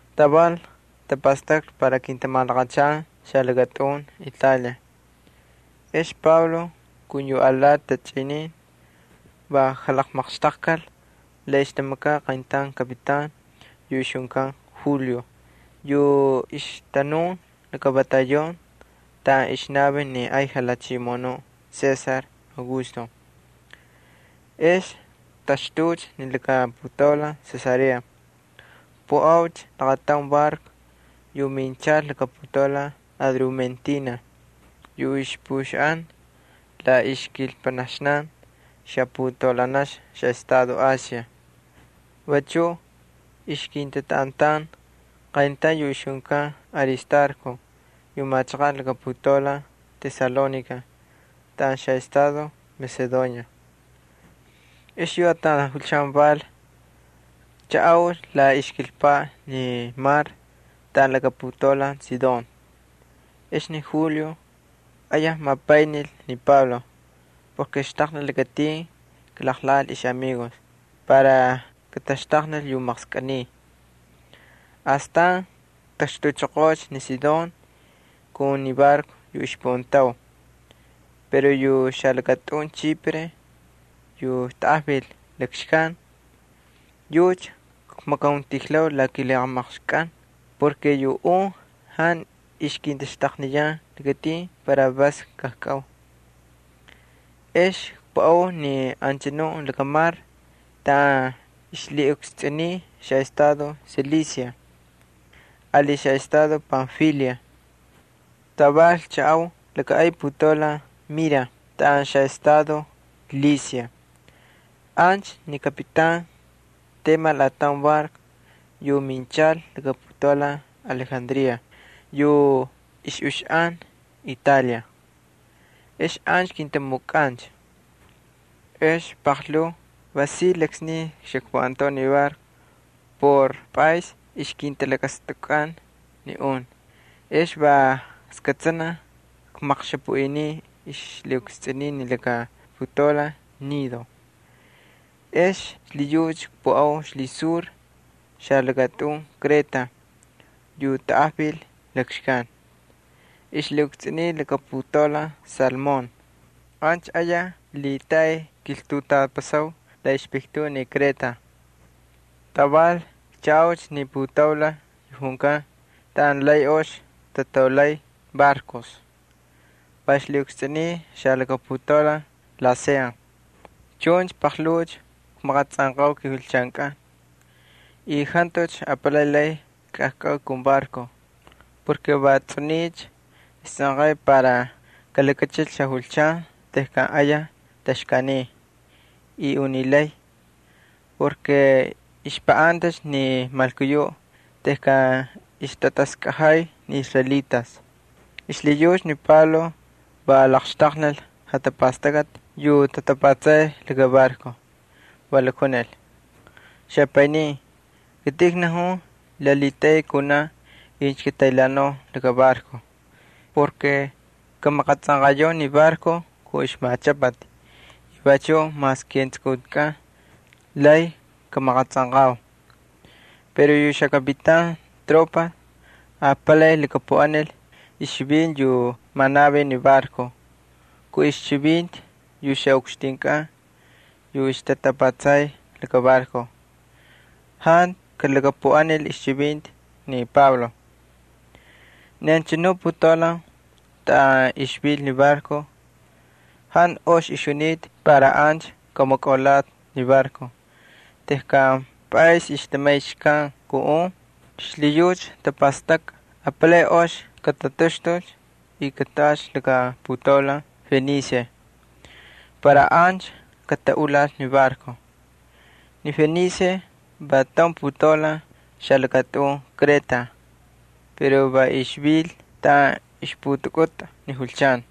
Taval tapastaklhi para kintamalaqachan xalakatꞌun Italia. Ex Pablo kun yu alati tachꞌinin va jalaqmaqxtaqkal la ixtamakaꞌ qayntaun kapitan yu ixjunkan Julio yu ixtanun laka batallón taꞌan ixnavin ni ay jalhachimoꞌonuꞌ César Augusto. Ex ktaxtuucha ni laka putaulan Cesarea, kpuꞌaucha laqataun barco yu minchal laka putaulan Adrumentina yu ixpuꞌuxaꞌan la ixkilpanaxnan xaputaulanaxna xaꞌestado Asia. Vachuꞌ ixkintatꞌaꞌantan qayntaun yu ixjunkan Aristarco yu machaqaꞌ laka putaulan Tesalónica taꞌan xaꞌestado Macedonia. Ex yu ataun julchan val, kchaꞌaucha la ixkilpaꞌ ni mar taꞌan laka putaulan Sidón. Ex ni Julio ayaj mapaynil ni Pablo porke xtaqnil lakatin kalaqlaqꞌal ixꞌamigos para kataxtaqnil ixmaqskꞌiniti. Astan ktaxtuchoqoocha ni Sidón kun ni barco yu ixkpuꞌantau. Pero yu xalakatꞌun Chipre yu tanꞌajvil lakxkan, yucha kmakauntijlau la kilhijamaqxkꞌan porke yu un jantu ixkintaxtaqniyan lakatin para vas kajkꞌau. Ex kpuꞌau ni anchanu lakamar taꞌan ixlhiꞌukstsꞌuniy xaꞌestado Cilicia ali xaꞌestado Panfilia, taval kchaꞌau laka ay putaulan Mira taꞌan xaꞌestado Licia. Ancha ni kapitan temal ataun barco yu minchal laka putaulan Alejandría yu ixꞌuxaꞌan Italia. Ex ancha kintamukꞌancha. Ex paqlhuu va si laksniy xakpuꞌantau ni barco por pꞌays ixkintalakatastukꞌan ni un ex va skꞌatsanaj kmaqxapuꞌiniu ixlhiꞌukstsꞌuniy laka putaulan Gnido. Ex xlhiyucha kpuꞌau ixlhisur xalakatꞌun Kreta yu tanꞌajvil lakxkan, ixlhiꞌukstsꞌuniy laka putaulan Salmón. Ancha ayaj lhitaꞌay kiltutapasau la ixpiktuꞌ ni Kreta. Taval kchaꞌaucha ni putaulan yu junkan Taꞌan Lay Ox Tataulay Barcos, va ixlhiꞌukstsꞌuniy xaputaulan Lasea. Chuncha paqlhuucha kmaqatsꞌanqau kijulchankꞌan, y jantucha apalay lay kajkꞌau kun barco porke va tsꞌuniycha istsꞌanqay para kalakachilcha xajulchan tejkan ayaj taxkaaniy y unilay. Vachuꞌ ixpaꞌantacha ni malkuyuꞌ tejkan ixtataskꞌajay ni israelitas. Xlhiyucha ni Pablo va laqxtaqnil jatapastakꞌati yu tatapatsay laka barco, va lakjunil: —Xapaynin, kitꞌin knajun la lhitaꞌay kunaꞌ incha kataylhaanau laka barco. Kamaqatsꞌanqayau ni barco kun ixmachꞌapati y vachuꞌ mas ketsukuntikꞌan lay kamaqatsꞌanqau. Pero yu xakapitan tropas apalay lhakapuꞌanil ixchivinti yu manavin ni barco kun ixchivinti ni ixꞌukxtinkꞌan yu ixtatapatsay laka barco. Jantu kalhakapuꞌanil ixchivinti ni Pablo. Ni anchanu putaulan taꞌan ixvil ni barco jantu ox ixjunita para ancha kamukꞌulatꞌi ni barco tejkan pꞌaysni ixtamay xkan kun un. Xlhiyucha ixtapastakꞌa apalay ox katataxtulcha y kataꞌalcha laka putaulan Fenice para ancha kataꞌulal ni barco. Ni Fenice va taun putaulan xalakatꞌun Kreta pero va ixvil taꞌan ixputakꞌutꞌa ni julchan.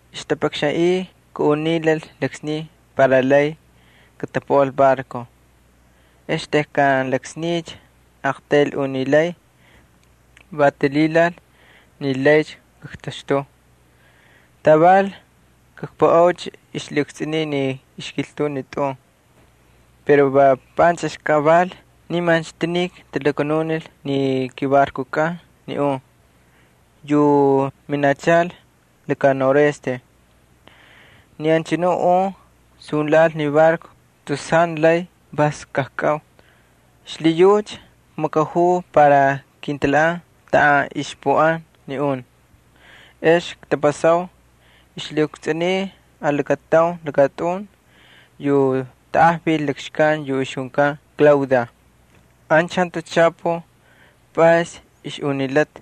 Ixtapakxanꞌiy kaꞌunilal laksniy para lay katapuꞌal barco. Ex tejkan laksniycha aqtayl unilay, va talhilal ni laycha kaktaxtuu. Taval kpuꞌaucha ixlhiꞌukstsꞌuniy ixkiltuꞌ ni tꞌun. Pero va panchꞌixkaꞌ val nimancha tinik talakanunil ni kibarcokꞌan ni un yu minachal laka noroeste. Ni anchanu un sunlhaꞌal ni barco tus jantu lay vas kajkꞌau. Xlhiyucha kmakajuu para kintalhaꞌan taꞌan ixpuꞌan ni un. Ex ktapasau ixlhiꞌukstsꞌuniy lakataun lakatꞌun yu tanꞌajvil lakxkan yu junkan Klauda. Ancha jantucha chapuj pꞌays ixꞌunilata,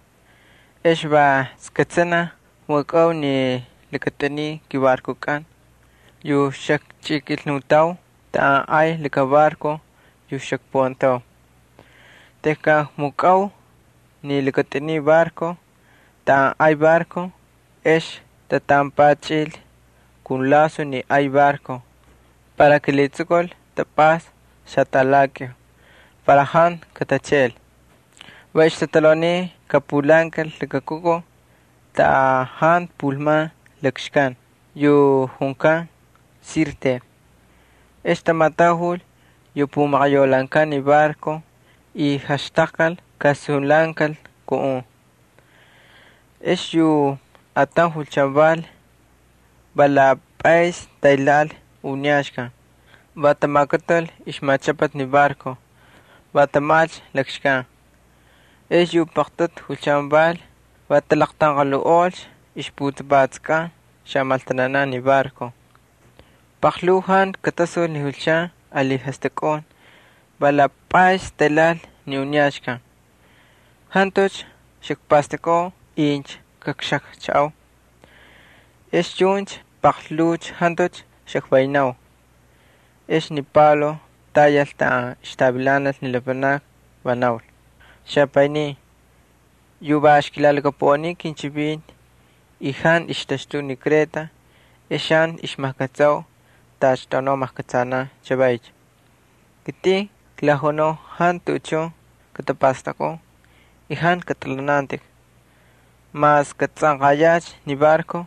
ex va skꞌatsanaj kmukꞌau yu lakatꞌuniy kibarcokꞌan yu xakchꞌikilnutau taꞌan ay laka barco yu xakpuꞌantau. Tejkan kmukꞌau ni lakatꞌuniy barco taꞌan ay barco ex tatampachꞌil kun laso ni ay barco para kalhitsukul tapꞌasta xaltaꞌalakꞌiu para jantu katacheꞌel. Va ixtatalhauniy kapulhaankal laka kukuj taꞌan jantu pulman lakxkan yu junkan Sirte. Ex tamatajul yu pumaqayaulhaankan ni barco y jaxtaqkal kasunlhaꞌankal kun un. Ex yu ataun julchan val, va la pꞌaysni taylhaꞌal uniyaxkan, va tamakutul ixmachꞌapati ni barco, va tamajꞌalcha lakxkan. Ex yu paqtꞌutu julchan val, talaqtanqalhuꞌolcha ixputapatskꞌan xamaltananan ni barco. Paqlhuu jantu katasul ni julchan ali jastꞌakun, va la pꞌays taylhaꞌal ni uniyaxkan. Jantucha xakpastakꞌau incha kakxajchaꞌau. Ex chuncha paqlhuucha jantucha xakvaynau, ex ni Pablo tayal taꞌan ixtavilanal ni lapanakni, va naul: —Xapaynin, yu va ixkilalhakapuꞌaniu kinchivinti y jantu ixtaxtuu ni Kreta ex jantu ixmajkꞌatsau tacha tꞌaunau majkꞌatsanan chavaycha. Kitꞌin klajunau jantu tuꞌuchun katapastakꞌun y jantu katꞌalhanantꞌik. Mas katsꞌanqayaꞌ ni barco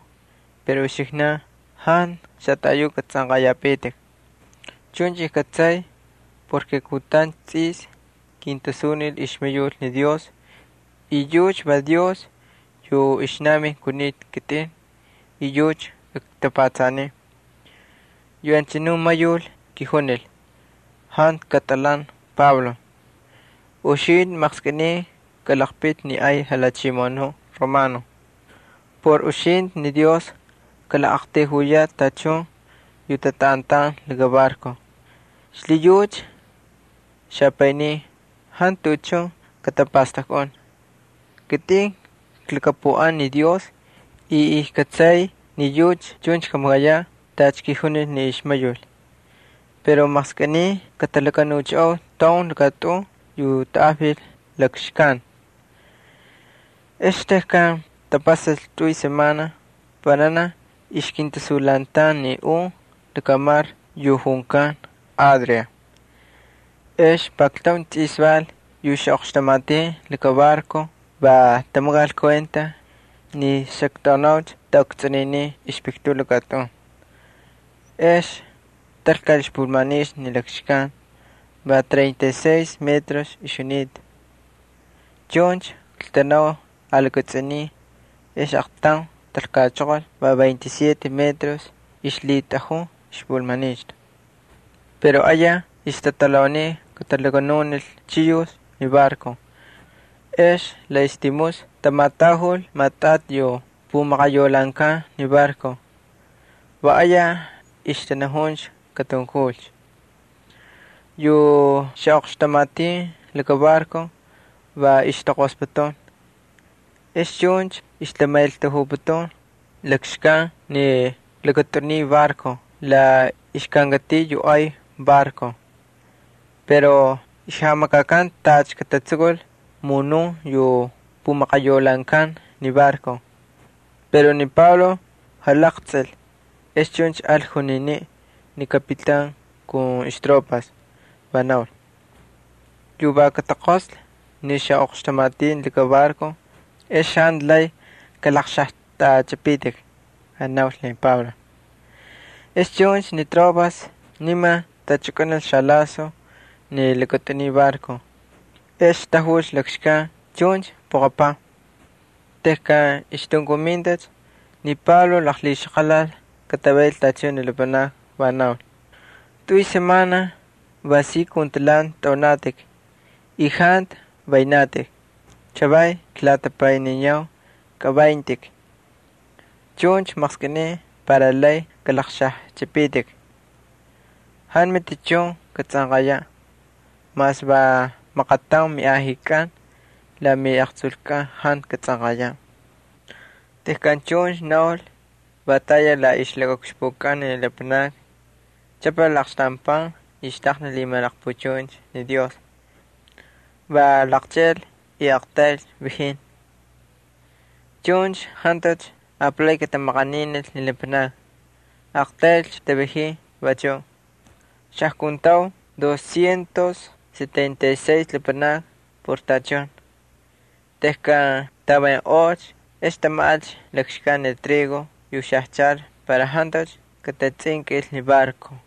pero uxiknankꞌan jantu xataꞌayuꞌ katsꞌanꞌayapitik. Chuncha kꞌatsay porke kutancha tsꞌis kintasunil ixmayul ni Dios, y yucha va Dios yu ixnavin kunita kitꞌin y yucha ktapatsaniy. Yu anchanu ixmayul kijunil: “Jantu katꞌalhan, Pablo. Uxintꞌi maqskꞌiniy kalaqpiti ni ay jalhachimoꞌonuꞌ Romano. Por uxintꞌi ni Dios kalaqꞌaqtayjuyaꞌ tachun yu tatꞌaꞌantan laka barco.” Xlhiyucha, xapaynin, jantu tuꞌuchun katapastakꞌun. Kitꞌin klhakapuꞌan ni Dios y kꞌatsay ni yucha chuncha kamakayaꞌ tacha kijunil ni ixmayul. Pero maqskꞌiniy katalakanuchaꞌau taun lakatꞌun yu tanꞌajvil lakxkan. Ex tejkan tapasal tꞌuy semana vananaj ixkintasunlhaꞌantan ni un lakamar yu junkan Adria. Ex pakltaun tsꞌis val yu xaꞌoqxtamatin laka barco va tamakal kuenta ni xaktꞌaunaucha taꞌukstsꞌuninin ixpiktuꞌ laka tꞌun. Ex talkal ixpulmanixtu ni xkan va treinta y seis metros ixjunita. Chuncha kaltanau alakatsꞌuniy, ex aqtaun talkachoqol va veinte y siete metros ixlhitꞌajun ixpulmanixtu. Pero ayaj ixtatalhauniy katalakanunil chiyux ni barco ex la ixtimusna tamatajul maꞌatꞌati yu pumaqayaulhaankan ni barco. Va ayaj ixtanajun katunkulcha. Yu xaꞌoqxtamatin laka barco va ixtaqosputun. Ex chuncha ixtamaꞌeltajuputun lakxkan ni lakatꞌuniy barco la ixkankatiꞌ yu ay barco. Pero ixjamakakan tacha katatsukul munun alati yu pumaqayaulhaankan ni barco. Pero ni Pablo jalaqtsꞌil, ex chuncha al juniniꞌ ni kapitan kun ixtropas, va naul: —Incha kataqoslhi ni xaꞌoqxtamatin laka barco ex jantu lay kalaqxajtꞌachꞌipitik —naul ni Pablo. Ex chuncha ni tropas niman tachꞌukꞌunil xalaso ni lakatꞌuniy barco, ex tajulcha lakxkan chuncha puqapaj. Tejkan ixtunkumintacha ni Pablo laqlhixaqalal katavayl tachun ni lapanakni, va naul: —Tꞌuycha semana va si kun talhanti tꞌaunatꞌik y jantu vaynatꞌik. Chavay klatapayniniyau kavayntꞌik, chuncha maqskꞌiniy para lay kꞌalaqxajchipitik. Jantu matichun katsꞌanqayaꞌ, mas va maqataun miꞌajikꞌan la miꞌaqtsulkꞌan jantu katsꞌanqayaꞌ. Tejkan chuncha naul, va tayal la ixlakaꞌukxpukꞌan ni lapanakni, chꞌapal aqxtaun pan y xtaqnil lhimalaqpuchuncha ni Dios. Va laqcheꞌel y aqtaylcha vajin. Chuncha jantucha apalay katamaqaninil ni lapanakni. Aqtaylcha tavajin vachuꞌ. Xajkuntau doscientos setenta y seis lapanakni por tachun. Tejkan tavaynꞌolcha ex tamajꞌalcha lakxkan ni trigo yu xajchal para jantucha katatsꞌinkꞌil ni barco.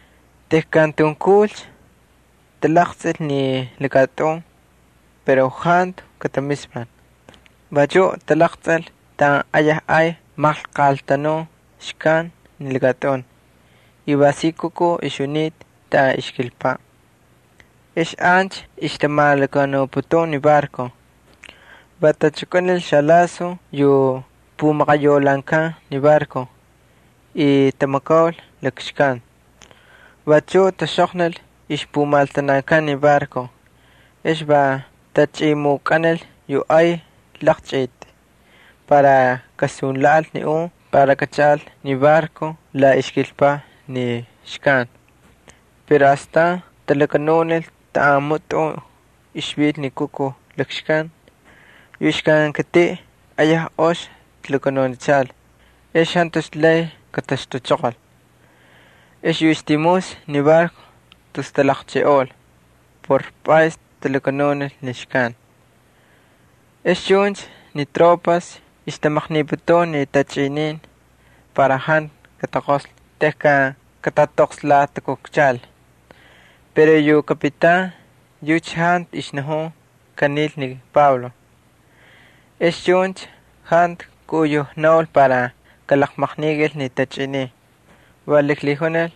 Tejkan tunkulcha, talaqtsꞌilcha ni lakatꞌun pero jantu katamispal. Vachuꞌ talaqtsꞌil taꞌan ayaj ay maqlqatanun xkan ni lakatꞌun y va si kukuj ixjunita taꞌan ixkilpaꞌ. Ex ancha ixtamalakanuputun ni barco. Va tachukꞌunil xalaso yu pumaqayaulhaankan ni barco y tamakaul lakxkan. Vachuꞌ taxꞌoqnil ixpumaltanakan ni barco. Ex va tachꞌimukꞌanil yu ay laqchꞌiti para kasunlhaꞌal ni un para kachaꞌal ni barco la ixkilpaꞌ ni xkan. Pero astan talakanunil taꞌan mutꞌun ixvil ni kukuj lakxkan. Yu ixkankatiꞌ ayaj ox talakanuchal ex jantucha lay kataxtuchoqol. Ex yu ixtimusna ni barco tus talaqcheꞌeꞌol por pꞌays talakanunil ni xkan. Ex chuncha ni tropas ixtamaqniputun ni tachꞌinin para jantu kataqoslhi tejkan katatoqslatakukchal. Pero yu kapitan yucha jantu ixnajun kanil ni Pablo. Ex chuncha jantu kaꞌuyujnaul para kalaqmaqnikal ni tachꞌinin. Va laklhijunil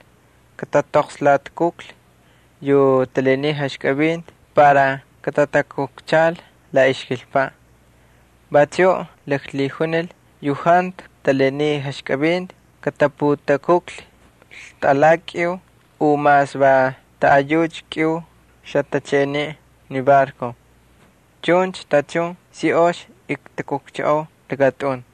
katatoqslatakuklhi yu talaniy jaxkivinti para katatakukchal la ixkilpaꞌ. Vachuꞌ laklhijunil yu jantu talaniy jaxkivinti kataputakuklhi ltaꞌalakꞌiu u mas va taꞌayucha kꞌiu xatacheꞌeniꞌ ni barco. Chuncha tachun si ox ktakukchaꞌau lakatꞌun.